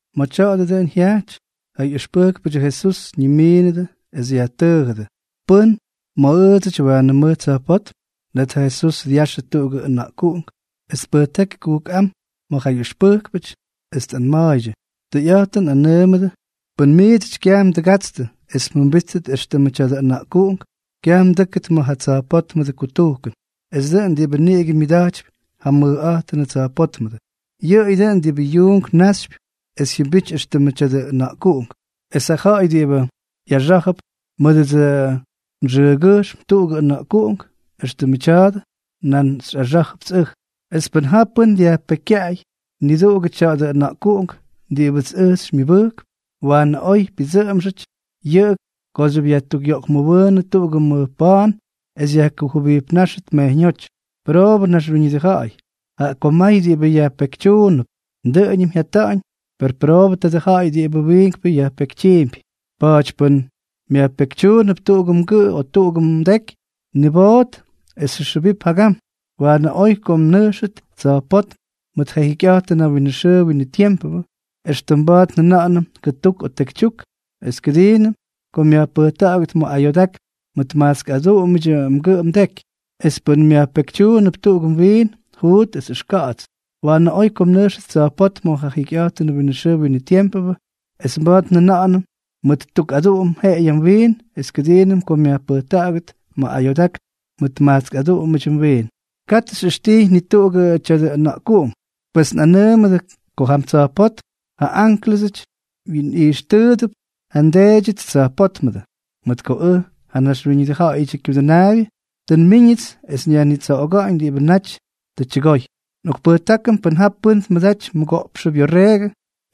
Ma̱ tya̱a̱dʉ dʉꞌʉn jyajty, ja ꞌyʉxpʉjkpʉdyʉ Jesús ñimiinʉdʉ es yajtʉʉjʉdʉ: —¿Pʉ́n ma̱ ʉʉdsʉty waanʉ mʉj tsa̱jpótm? Net ja Jesús dyaxʉ tuꞌugʉ ʉna̱ꞌkuꞌunk, es tpʉjtáky kujkꞌám ma̱ ja ꞌyʉxpʉjkpʉty, es tꞌanma̱a̱ydyʉ: —Tʉyꞌa̱jtʉn nꞌanʉʉmʉdʉ, pʉn miidsʉty kyaj mdʉgatstʉ es mjʉmbítʉt éxtʉmʉ tya̱dʉ ʉna̱ꞌkuꞌunk, kyaj mdʉ́kʉt ma̱ ja tsa̱jpótmʉdʉ kutujkʉn. Es dʉꞌʉn diꞌibʉ niꞌigʉ myʉda̱jtypy ja mʉjꞌa̱jtʉnʉ tsa̱jpótmʉdʉ, yʉꞌʉyʉ dʉꞌʉn diꞌibʉ yuunk náxypyʉp es jyʉmbity éxtʉmʉ tya̱dʉ ʉna̱ꞌkuꞌunk. Es ja ja̱ꞌa̱y diꞌibʉ ꞌyaxá̱jʉp mʉdʉdsʉ nxʉʉgyʉjxm tuꞌugʉ ʉna̱ꞌkuꞌunk éxtʉmʉ tya̱a̱dʉ, nan xyꞌaxá̱jʉpts ʉj. ’Es pʉn ja pʉ́n dyajpekykyaꞌay niduꞌugʉ tya̱dʉ ʉna̱ꞌkuꞌunk diꞌibʉts ʉj xymyʉbʉjkp, waanʉ oy pyʉdsʉꞌʉmxʉty yʉꞌʉ kooxyʉp yajtukꞌyoꞌkmʉwʉʉnʉ tuꞌugʉ mʉj pa̱a̱n es yajkujʉbijpnáxʉt mejyñóty. ¡Pʉroobʉ naxwíñʉdʉ ja̱ꞌa̱y, jaꞌa ko may diꞌibʉ yajpekytyuump! Dʉꞌʉñʉm jyata̱ꞌa̱ñ, per ¡pʉroobʉ tadʉ ja̱ꞌa̱y diꞌibʉ wiinkpʉ yajpekytyiimpy! ’Pa̱a̱ty pʉn myajpekytyuunʉp tuꞌugʉ mgʉꞌʉ o tuꞌugʉ mdeky, niboot es ʉxjʉwip jagam. Waanʉ oy ko mnʉjxʉt tsa̱jpótm ma̱ ja jikyꞌa̱jtʉnʉ winʉ xʉʉ winʉ tiempʉ, éxtʉm mba̱a̱t njʉna̱ꞌa̱nʉm kʉtuk o tekytyuk, es kʉdiinʉm ko myajpʉjta̱ꞌa̱gʉt ma̱ ayoodákn mʉt majtsk aduꞌumʉdyʉ mgʉꞌʉ mdeky. Es pʉn myajpekytyuunʉp tuꞌugʉ mwiin, juut es ʉxka̱ꞌa̱ts. Waanʉ oy ko mnʉjxʉt tsa̱jpótm ma̱ ja jikyꞌa̱jtʉnʉ winʉ xʉʉ winʉ tiempʉ, éxtʉm mba̱a̱t njʉna̱ꞌa̱nʉm mʉt tuk aduꞌum jeꞌeyʉ mwiin es kʉdiinʉm ko myajpʉjta̱ꞌa̱gʉt ma̱ ayoodákn mʉt majtsk aduꞌumʉdyʉ mwiin. ’Katʉ xyꞌʉxtijy ni tuꞌugʉ tya̱dʉ ʉna̱ꞌkuꞌunk. Pes nꞌanʉʉmʉdʉ ko jam tsa̱jpótm ja ánklʉsʉty wyinꞌijxtʉʉdʉp ja nDeedyʉts tsa̱jpótmʉdʉ. Mʉt ko ʉj, ja Naxwíñʉdʉ Ja̱ꞌa̱yʉdyʉ Kyudʉnaabyʉ, tʉ nmíñʉts esʉts nyajnitsoꞌoga̱ꞌa̱ñ diꞌibʉ naty tʉ tyʉgoy. ’Nꞌokpʉjtákʉm pʉn ja pʉ́n tmʉdaty mʉgoꞌpxʉ byorreegʉ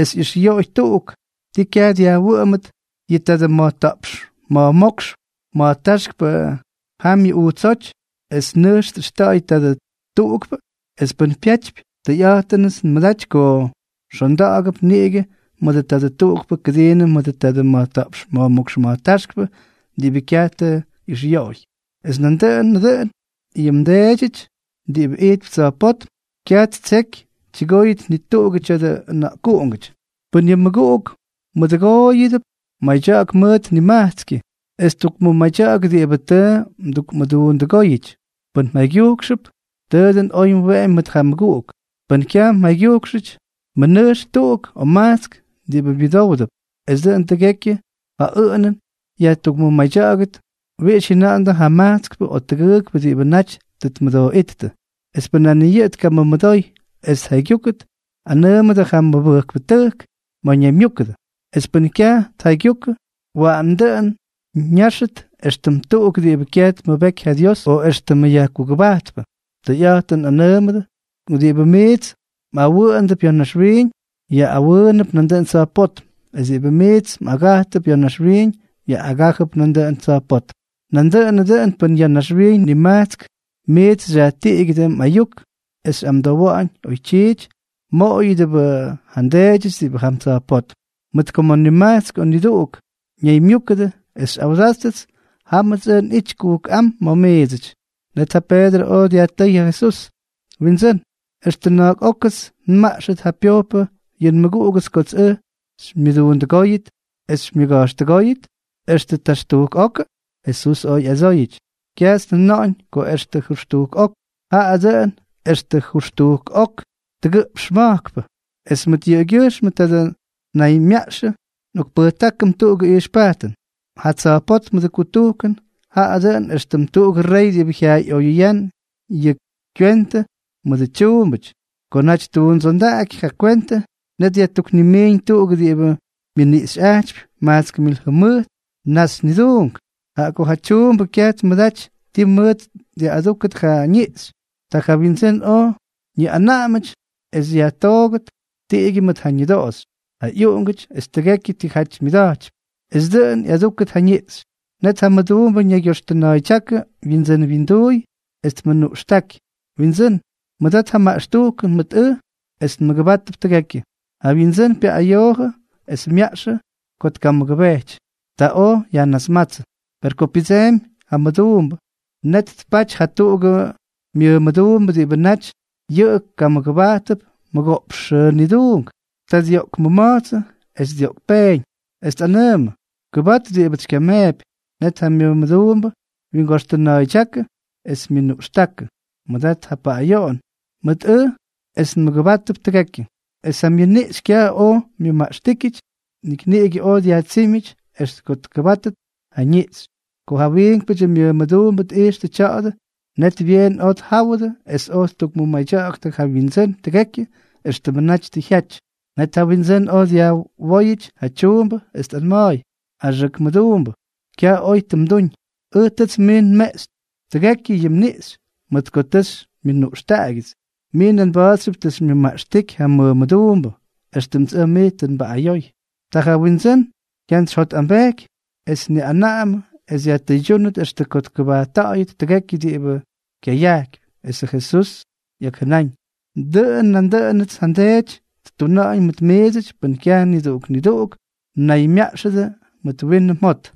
es ꞌyʉxꞌyoꞌoy tuꞌuk, ¿ti kyaj dyajwʉꞌʉmʉt yʉ tadʉ ma̱jta̱ꞌpx ma̱jmókx ma̱jtáxkpʉ jamyʉ ujtsóty, es nʉjx tꞌʉxta̱ꞌa̱y tadʉ tuꞌukpʉ? Es pʉn pyatypy, tʉyꞌa̱jtʉnʉts nmʉdaty ko xonda̱ꞌa̱gʉp niꞌigʉ mʉdʉ tadʉ tuꞌukpʉ kʉdiinʉm mʉdʉ tadʉ ma̱jta̱ꞌpx ma̱jmókx ma̱jtáxkpʉ diꞌibʉ kyaj tʉ ꞌyʉxꞌyoꞌoy. Es nandʉꞌʉnʉ dʉꞌʉn yʉ mDeedyʉty diꞌibʉ ijtp tsa̱jpótm, kyaj ttseky tyʉgóyʉt ni tuꞌugʉ tya̱dʉ ʉna̱ꞌkuꞌungʉty. ’Pʉn yʉ mmʉguꞌuk mmʉdʉgooyʉp, madya̱ꞌa̱k mʉʉt nimajtskyʉ, es tukmʉmadya̱ꞌa̱k diꞌibʉ tʉ mdukmʉduundʉgóyʉty. Pʉn mjaygyujkxʉp, tʉ dʉn oy mweꞌemy mʉt ja mmʉguꞌuk. Pʉn kyaj mjaygyúkʉty, mʉnʉjx tuꞌuk o majtsk diꞌibʉ myʉdówdʉp, es dʉꞌʉn tʉgekyʉ ja ʉꞌʉnʉn yajtukmadya̱ꞌa̱gʉt wiꞌix jyʉna̱ꞌa̱ndʉ ja majtskpʉ o tʉgʉʉkpʉ diꞌibʉ naty tʉ tmʉdooꞌíttʉ. Es pʉn nan ni yʉꞌʉ tkamʉmʉdoy es tjaygyúkʉt, anʉʉmʉdʉ ja mʉmʉbʉjkpʉtʉjk ma̱ ñaymyúkʉdʉ. Es pʉn kyaj tjaygyukʉ, waꞌan dʉꞌʉn ñáxʉt éxtʉm tuꞌuk diꞌibʉ kyaj tmʉbeky ja Dios o éxtʉmʉ yajkugʉbajtpʉ. Tʉyꞌa̱jtʉn nꞌanʉʉmʉdʉ ko diꞌibʉ miits mꞌawʉꞌʉndʉp ya̱ naxwiiñ, yaꞌꞌawʉʉnʉp nandʉꞌʉn tsa̱jpótm, es diꞌibʉ miits mꞌagajtʉp ya̱ naxwiiñ, yaꞌꞌagájʉp nandʉꞌʉn tsa̱jpótm. ’Nandʉꞌʉnʉ dʉꞌʉn pʉn ya̱ naxwiiñ nimajtsk miits xyajtiꞌigyʉdʉ mꞌayuk es xyꞌamdowa̱ꞌa̱ñ oytyiity, mmoꞌoyʉdʉbʉꞌʉ ja nDeedyʉts diꞌibʉ jam tsa̱jpótm. Mʉt ko ma̱ nimajtsk o nidʉgʉʉk mnaymyúkʉdʉ es xyꞌawdáttʉts, jámʉts ʉj nꞌity kujkꞌám ma̱ miidsʉty. Net ja Peedrʉ oj dyajtʉ́y ja Jesús: —Windsʉ́n, ¿extʉ na̱a̱k ókʉts nmaꞌxʉt ja pyojpʉ yʉ nmʉguꞌugʉts kots ʉj xymyʉduundʉgóy xymyʉga̱jxtʉgóy? ¿Extʉ jʉxtujk okʉ? Jesús oj ꞌyadsóyʉty: —Kyajts njʉna̱ꞌa̱ñ ko extʉ jʉxtujk ok, jaꞌa dʉꞌʉn extʉ jʉxtujk ok tʉgʉꞌpx ma̱jkpʉ. ’Es mʉt yʉꞌʉgyʉjxm tadʉ naymyaꞌxʉ nꞌokpʉjtákʉm tuꞌugʉ ijxpajtʉn. Ja tsa̱jpótmʉdʉ kutujkʉn jaꞌa dʉꞌʉn éxtʉm tuꞌugʉ rey diꞌibʉ jyayaꞌoyʉyán yʉ kywentʉ mʉdʉ tyuumbʉty. Ko naty ttuundsondaꞌaky ja kwentʉ, net yajtuknimiiñ tuꞌuk diꞌibʉ myʉniꞌxyꞌajtypy majtsk mil jʉmʉjt naxy niduunk. Jaꞌa ko ja tyuumbʉ kyaj tmʉdaty ti mʉʉt dyaꞌꞌadúkʉt ja ñiꞌxy, ta ja wyindsʉ́n oj ñiꞌanaꞌamʉty es yajtoogʉt, tiꞌigyʉ mʉt ja ñʉdoꞌoxy, ja ꞌyuꞌungʉty es tʉgekyʉ tijaty myʉda̱jtypy, es dʉꞌʉn ꞌyadúkʉt ja niꞌxy. Net ja mʉduumbʉ ñaygyoxtʉna̱a̱ydyákʉ wyindsʉ́n winduuy, es tmʉnuꞌxtáky: “Windsʉ́n, mʉdat ja maꞌxtujkʉn mʉt ʉj es nmʉgʉbátʉp tʉgekyʉ.” Ja wyindsʉ́n pyaꞌꞌayoojʉ es myaꞌxʉ ko tkamʉgʉbejty. Ta oj yajnasmátsʉ. ’Per ko pyʉdseemy ja mʉduumbʉ, net tpaty jatuꞌugʉ myʉmʉduumbʉ diꞌibʉ naty yʉꞌʉ kamʉgʉbajtʉp mʉgoꞌpx xʉʉ niduunk. Ta dyoꞌkmʉma̱jtsʉ es dyoꞌkpéñ, es tꞌanʉʉmʉ: “¡Kʉbat diꞌibʉts xykyameepy!” Net ja myʉmʉduumbʉ wyingoxtʉna̱a̱ydyákʉ, es myʉnuꞌxtákʉ: “Mʉdat ja paꞌꞌayoꞌon mʉt ʉj es nmʉgʉbátʉp tʉgekyʉ.” Es ja myʉniꞌxy kyaj oj myʉmaꞌxtíkyʉty, nik niꞌigʉ oj dyajtsímyʉty extʉ ko tkʉbátʉt ja ñiꞌxy. ’Ko ja wiinkpʉdyʉ myʉmʉduumbʉ tꞌijxtʉ tya̱a̱dʉ, net byeen oj tjáwʉdʉ es oj ttukmʉmadya̱ꞌa̱ktʉ ja wyindsʉ́n tʉgekyʉ éxtʉmʉ naty tʉ jyaty. Net ja windsʉ́n oj dyajwóyʉty ja tyuumbʉ, es tꞌanma̱a̱y: “¡Axʉk mʉduumbʉ, kyaj oy tʉ mduñ! Ʉj tʉts mij nmeꞌxy tʉgekyʉ yʉ mniꞌxy mʉt ko tʉ xymyʉnuꞌxtaꞌagyʉts. Mij nan mba̱a̱txyʉp tʉ xymyʉmaꞌxtíky ja mmʉmʉduumbʉ, éxtʉmts ʉj mij tʉ nbaꞌꞌayoy.” Ta ja windsʉ́n jyantsyjyotꞌambejky, es tniꞌanaꞌamʉ es yajtʉydyúnʉt extʉ ko tkʉbajtta̱ꞌa̱yʉt tʉgekyʉ diꞌibʉ kyayajkypy. Esʉ Jesús ꞌyakjʉnáñ: —Dʉꞌʉn nandʉꞌʉnʉts ja nDeedyʉts ttuna̱ꞌa̱ñ mʉt miidsʉty pʉn kyaj niduꞌuk niduꞌuk mnaymyaꞌxʉdʉ mʉt winʉ mjot.